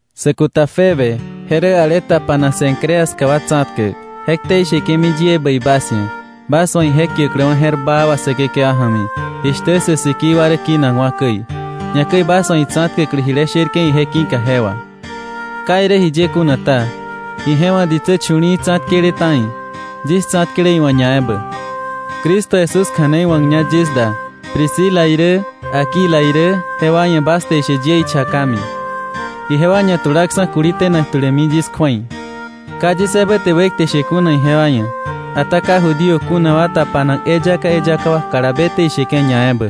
Sä kuta Febe, je rä ale tapanak Cencrea ska wa tsa̱tkäk, je ktei sheke̱mi yie bäi bas ia̱, bas wa̱ ije kiäkläwa̱ je̱r baa wà, Säkekewa ja̱mi, jishtä sä sikii wa rä kinakwa̱ käi, ñakäi bas wa̱ itsa̱tkäklä jile sherke̱ ije ki̱ka je wà. Ka irä jiye kuna ta, ije wa̱ ditsä chu̱li̱i̱ tsa̱tkele ta̱i; yis tsa̱tkele iwa̱ ñaebä. Cristo Jesús kja̱nei wa̱kña yis da Priscila irä, Aquila irä, jewa ia̱ bas te ishe yie ichakami. Ijewa ñatulaksa̱ kuli tenak tulämi yis kju̱ei. Ka yis ebä te wekte she kuna ijewa ia̱, ata ka Judío kuna wa tapanak eyaka eyaka wa kalabe te isheke̱ ñaebä.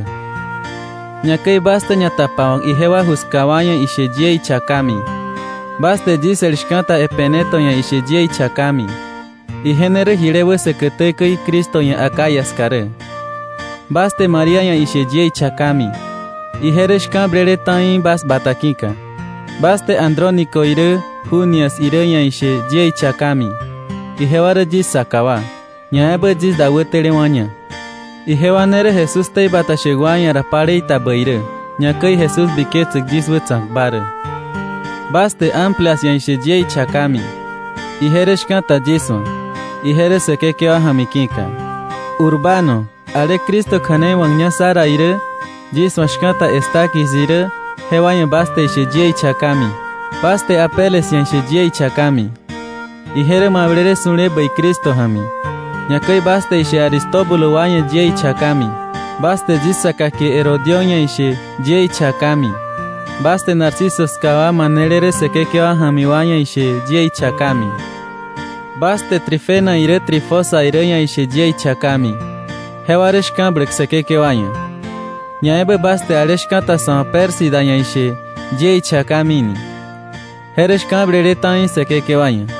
Ñakäi bas te ñatapawa̱k ijewa ju ska wa ia̱ ishe yie ichakami. Bas te yis el shka̱ta Epeneto ia̱ ishe yie ichakami. Ije ne rä jile wä säkätä käi Cristo ia̱ Acaya ska rä. Bas te María ia̱ ishe yie ichakami. Ije rä shka̱blele ta̱i bas bata ki̱ka. Bas te Andrónico irä Junias irä ia̱ ishe yie ichakami. Ijewa rä yis saka wa, ñaebä yis da wätelewa̱ña. Ijewa ne rä Jesús ktei bata shäk wa ia̱ ra palei ta bäi rä, ñakäi Jesús biketsäk yis wätsa̱kba rä. Bas te Amplias ia̱ ishe yie ichakami. Ije rä shka̱ta yis wa̱, ije rä Säkekewa ja̱mi ki̱ka. Urbano, ale Cristo kja̱nei wa̱kña sá ra irä, yis wa̱ shka̱ta Estaquis irä, jewa ia̱ bas te ishe yie ichakami. Bas te Apeles ia̱ ishe yie ichakami. Ije rä mablele su̱le bäi Cristo ja̱mi. Ñakäi bas te ishe Aristóbulo wa ia̱ yie ichakami. Bas te yis saka kie Herodión ia̱ ishe yie ichakami. Bas te Narciso ska wa manele rä Säkekewa ja̱mi wa ia̱ ishe yie ichakami. Bas te Trifena irä Trifosa irä ia̱ ishe yie ichakami. Jewa rä shka̱bläk Säkekewa ia̱. Ñaebä bas te ale shka̱ta sa̱ wa̱ Pérsida ia̱ ishe yie ichakami ni. Je rä shka̱blele ta̱i Säkekewa ia̱.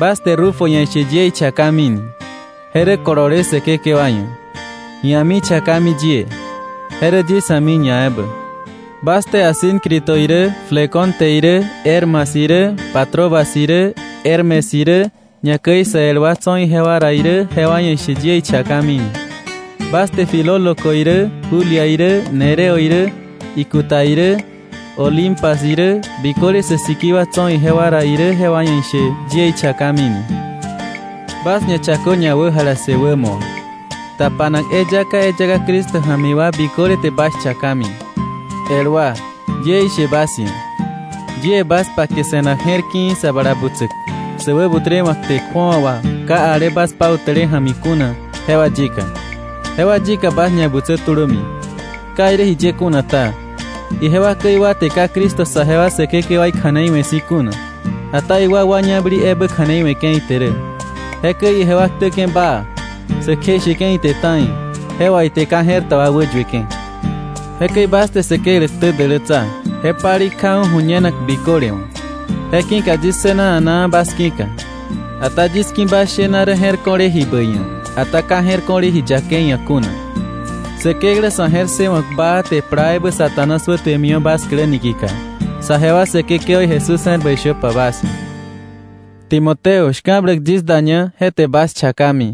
Bas te Rufo ia̱ ishe yie ichakami ni. Je rä kolole Säkekewa ia̱. Ia̱mi chakami yie; je rä yis a̱mi ñaebä. Bas te Asíncrito irä, Flegonte irä, Hermas irä, Patrobas irä, Hermes irä, ñakäi sa el wa tso̱ ijewa ra irä jewa ia̱ ishe yie ichakami ni. Bas te Filólogo irä, Julia irä, Nereo irä, ikuta irä, Olimpas irä, biköle sä sikii wa tso̱ ijewa ra irä jewa ia̱ ishe yie ichakami ni. Bas ñachakö ñawäjalassë wämo wa. Tapanak eyaka eyaka Cristo ja̱mi wa biköle te bas chakami. El wa, yie ishe bas ia̱, yie bas pake se̱nak je̱r ki̱i̱ sa bala butsäk, sä wäbutrewa̱k kte kju̱awa wà ka ale bas pautäle ja̱mi kuna, jewa yika. Jewa yika bas ñabutsö tulömi. Ka irä jiye kuna ta, ijewa käi wa te ka Cristo saje wa Säkekewaí kja̱nei we̱ si̱ kuna, ata iwakwa ñabäli ebä kja̱nei we̱ke̱ ite rä. Jekäi ijewa ktäke̱ baa, sä kjeisheke̱ ite ta̱i, je wà ite ka je̱r ta wa wäyueke̱. Jekäi bas te Säkeklä ktä dälätsa, je palei kjaju̱ ju̱ñenak biköle wa̱. Je ki̱ka yis ssëna a̱naa bas ki̱ka. Ata yis ki̱ bas shena rä je̱r ko̱le ji bäi ia̱, ata ka je̱r ko̱le ji yakei ia̱ kuna. Säkeklä sa̱ je̱r ssëwa̱k baa te plaa ebä Satanás wätuemiwa̱ bas klä niki̱ka. Saje wa Säkekewaí Jesús je̱r bäi shöpa bas ia̱. Timoteo, shka̱bläk yis daña, je te bas chakami.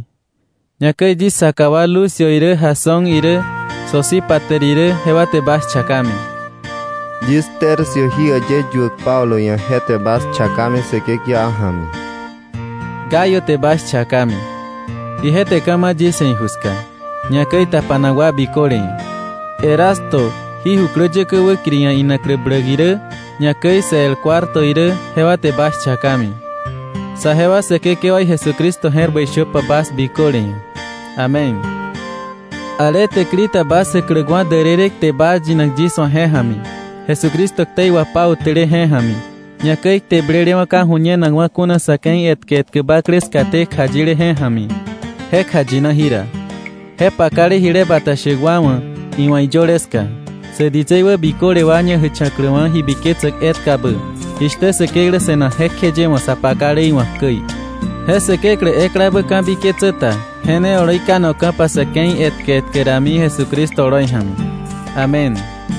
Ñakäi yis saka wa Lucio irä, Jasón irä, Sosípater irä, jewa te bas chakami. Yis Tercio jí äyë yuäk Pablo ia̱, je te bas chakami Säkekewa ja̱mi. Gayo te bas chakami. Ije te ka̱ ma̱ yis ia̱ iju ska, ñakäi tapanak wa biköle ia̱. Erasto, jí jukläyäkä wäkiri ia̱ inaklä bläk irä, ñakäi sä el Cuarto irä, jewa te bas chakami. Saje wa Säkekewaí Jesucristo je̱r bäi shöpa bas biköle ia̱. Amén. Ale täkili ta bas jäkläkwa̱ därërë kte baa yinak yis wa̱ je ja̱mi, Jesucristo ktei wapautäle je ja̱mi, ñakäi kte blelewa̱ ka ju̱ñenakwa̱ kuna sa̱ ke̱i etkä etkä bakle skaté kjayile je ja̱mi, je kjayina jira, je pakale jile bata shäk wa wa̱ iwa̱ iyöle ska, sä ditsei wä biköle wa ñajächa̱kläwa̱ ji biketsäk etkabä, jishtä Säkeklä se̱nak jekjeye wa̱ sa pakale iwa̱k käi, je Säkeklä eklabä ka̱biketsä ta, je ne oloi kanoka̱pa sa̱ ke̱i etkä etkä rami, Jesucristo oloi ja̱mi. Amén.